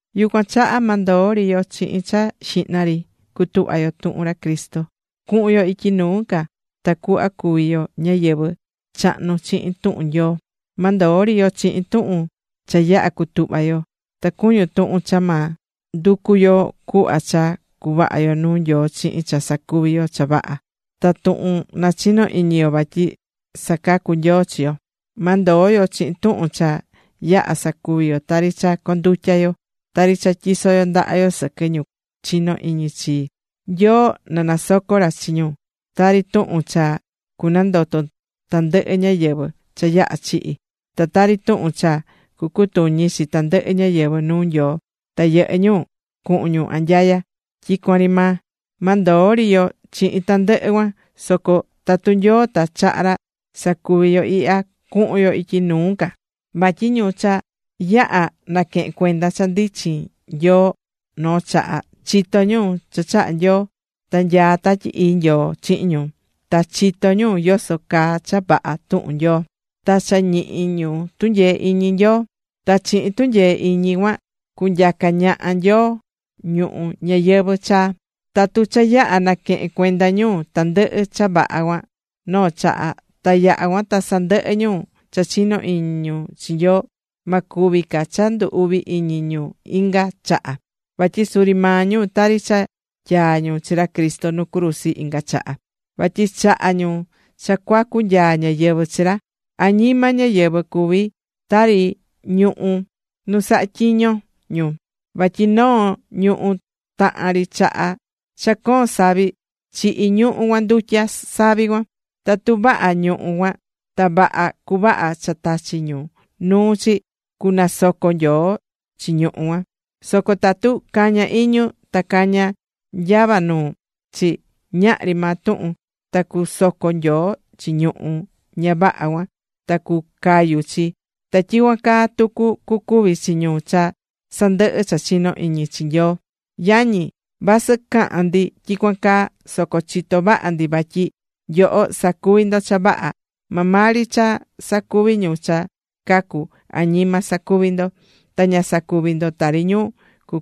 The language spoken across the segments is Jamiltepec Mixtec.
Yucuan chaha ma ndoo ri yo chihin cha xihna ri cutuhva̱ yo tuhun ra Cristo, cuhun yo ityi nuu ca tacuhva cuvi yo ñáyɨvɨ chahnu chihin tuhun Nyoo. Ma ndoo ri yo chihin tuhun cha yaha̱ cutuhva yo, ta cuñun tuhun cha ma nducu yo cuhva cha cuvaha yo nuu Nyoo chihin cha sacuví yo cha vaha, ta tuhun nachino iñi yo vatyi sacacú Nyoo chi yo. Ma ndoo yo chihin tuhun cha yaha̱ sacuvi yo, tari cha condutya yo, tari cha tyisó yo ndaha yo sɨquɨ ñu chiñó iñi chi Nyoo na nasoco ra chi ñu, tari tuhun cha cunandoto tandɨhɨ ñáyɨvɨ cha yaha̱ chihi̱, ta tari tuhun cha cucutuñi chi tandɨhɨ ñáyɨvɨ nuu Nyoo ta yɨhɨ́ ñu cuhun ñu anyaya tyicuan ri maa. Ma ndoo ri yo chihin tandɨhɨ cuan. Soco tatu Nyoo ta chaha ra, sacuvi yo ihya: cuhun yo ityi nuu ca. Vatyi ñu cha yaha̱ naquehe̱n cuenda cha ndichin Nyoo noo chaha, chitó ñu cha chahá Nyoo, ta nyaá Tatyi Ii Nyoo chihin ñu. Ta cha chitó ñu yoso caa cha vaha tuhun Nyoo, ta cha ñihi ñu tunyee iñi Nyoo. Ta chihin tunyee iñi cuan cunyaca ñaha Nyoo ñuhu̱ ñayɨvɨ̱ chaa. Tatu cha yaha̱ naquehe̱n cuenda ñu tandɨhɨ cha vaha cuan noo chaha, ta yaha̱ cuan ta sandɨhɨ ñu cha chinó iñi ñu chi Nyoo, ma cuvi ca cha ndu uvi iñi ñu inga chaha. Vatyi suri maa ñu tari cha tyaá ñu chi ra Cristo nu cruzi inga chaha, vatyi chahá ñu cha cuacu nyaa ñáyɨvɨ chi ra. Añima ñáyɨvɨ cuví tari noo ñuhú nu sahá tyiño ñu, vatyi noo ñuhú tahan ri chaha cha coon savi, chihí ñuhú cuan ndutya savi cuan. Tatu vaha ñuhú cuan ta vaha cuvaha cha tachi̱ ñu nuu chi, cunasoco Nyoo chi ñuhú cuan. Soco tatu cañá iñu ta cañá nyava nuu chi, ñahri maa tuhun. Ta cusoco Nyoo chi ñuhú ña vaha cuan ta cucayu chi. Ta tyicuan caa tucu cucuvi chi ñu cha sandɨhɨ̱ cha chinó iñi chi Nyoo. Yañi, vasɨ cahán ndi tyicuan caa, soco chitó vaha ndi vatyi nyoho sacuví ndo cha vaha, maa maa ri cha sacuví ñu cha cacú añima sacuví ndo, ta ña sacuví ndo tari ñu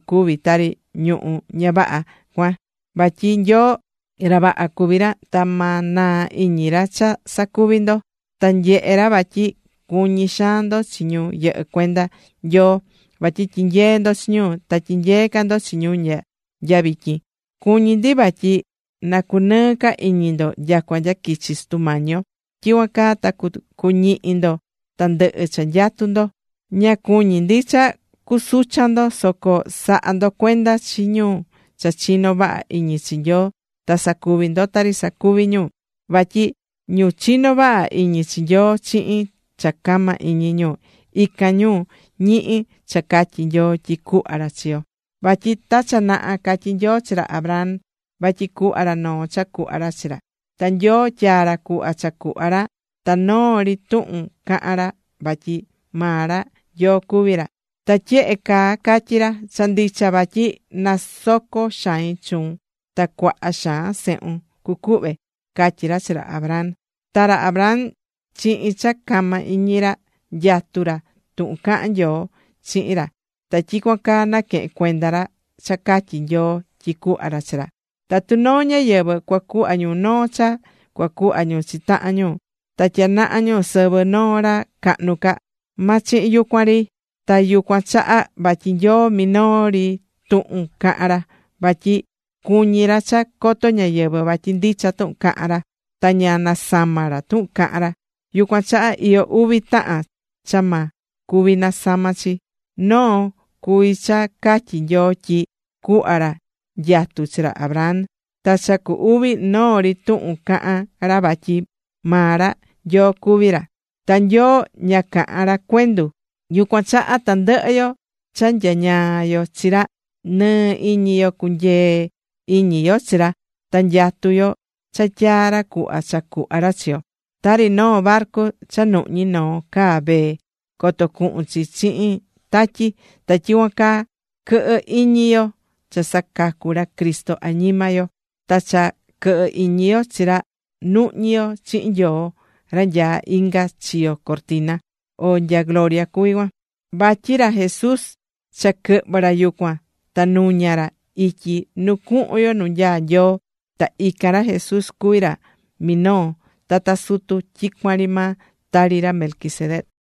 cuví tari ñuhú ña vaha cuan. Vatyi Nyoo, ra vaha cuví ra, ta ma naa iñi ra cha sacuví ndo. Ta nyehé ra vatyi cuñí xaan ndo chi ñu yɨhɨ́ cuenda Nyoo, vatyi tyinyee̱ ndo chi ñu, ta tyinyeé ca ndo chi ñu nya vityin. Cuñí ndi vatyi na cunɨɨ ca iñi ndo nyacua nya quichi Sutu Mañi yo, tyicuan caa ta cuñihi ndo tandɨhɨ cha nyatú ndo. Ña cuñí ndi cha cusuchan ndo, soco sa̱ha ndo cuenda chi ñu cha chinó vaha iñi chi Nyoo ta sa̱cuvi ndo tari sacuví ñu. Vatyi ñu chinó vaha iñi chi Nyoo chihin cha cama iñi ñu, ican ñu ñihí cha catyí Nyoo tyi cuhva ra chi yo. Vatyi ta cha naha catyi̱ Nyoo chi ra Abraham, vatyi cuhva ra noo cha cuhva ra chi ra. Ta Nyoo tyaa̱ ra cuhva cha cuhva ra, ta noo ri tuhun caha̱n ra vatyi maa ra, Nyoo cuví ra. Ta tyehe caa catyí ra: “Cha ndicha vatyi cunasoco xain chuun ta cuaha xaan sehun cucuhve”, catyí ra chi ra Abraham. Ta ra Abraham chihin cha cama iñi ra, nyatu̱ ra tuhun caha̱n Nyoo chihin ra, ta tyicuan caa naquehe̱n cuenda ra cha catyi̱ Nyoo tyi cuhva ra chi ra. Tatu noo ñáyɨvɨ cuacuhva ñu noo cha cuacuhva ñu chi tahan ñu ta tyanaha ñu sɨvɨ noo ra cahnu ca. Ma chihin yucuan ri. Ta yucuan chaha vatyi Nyoo minoo ri tuhun caha̱n ra, vatyi cuñi̱ ra cha coto ñáyɨvɨ vatyi ndicha tuhun cahán ra, ta ña nasamá ra tuhun cahán ra. Yucuan chaha iyó uvi tahan cha ma cuvi nasama chi. Noo cuví cha catyi̱ Nyoo tyi cuhva ra nyatu chi ra Abraham, ta cha cu uvi, noo ri tuhun cahan ra vatyi maa ra, Nyoo cuví ra. Ta Nyoo ña cahán ra cuendu. Yucuan chaha tandɨhɨ yo cha nyañaá yo chi ra, nɨɨ iñi yo cunyee iñi yo chi ra, ta nyatú yo cha tyaá ra cuhva cha cuhva ra chi yo. Tari noo barcu cha nuhñí noo caa vee, coto cuhun chi chihin tatyi, ta tyicuan caa quɨhɨ iñi yo cha sacacú ra Cristo añima yo. Ta cha quɨhɨ iñi yo chi ra, nuhñí yo chihin Nyoo ra nyaá inga chiyo cortina, o nya gloria cuví Cuan. Vatyi ra Jesús cha quɨhvɨ̱ ra yucuan ta nuña̱ ra ityi nu cuhun yo nu nyaá Nyoo. Ta ican ra Jesús cuví ra minoo tata sutu tyicuan ri maa, tari ra Melquisedec.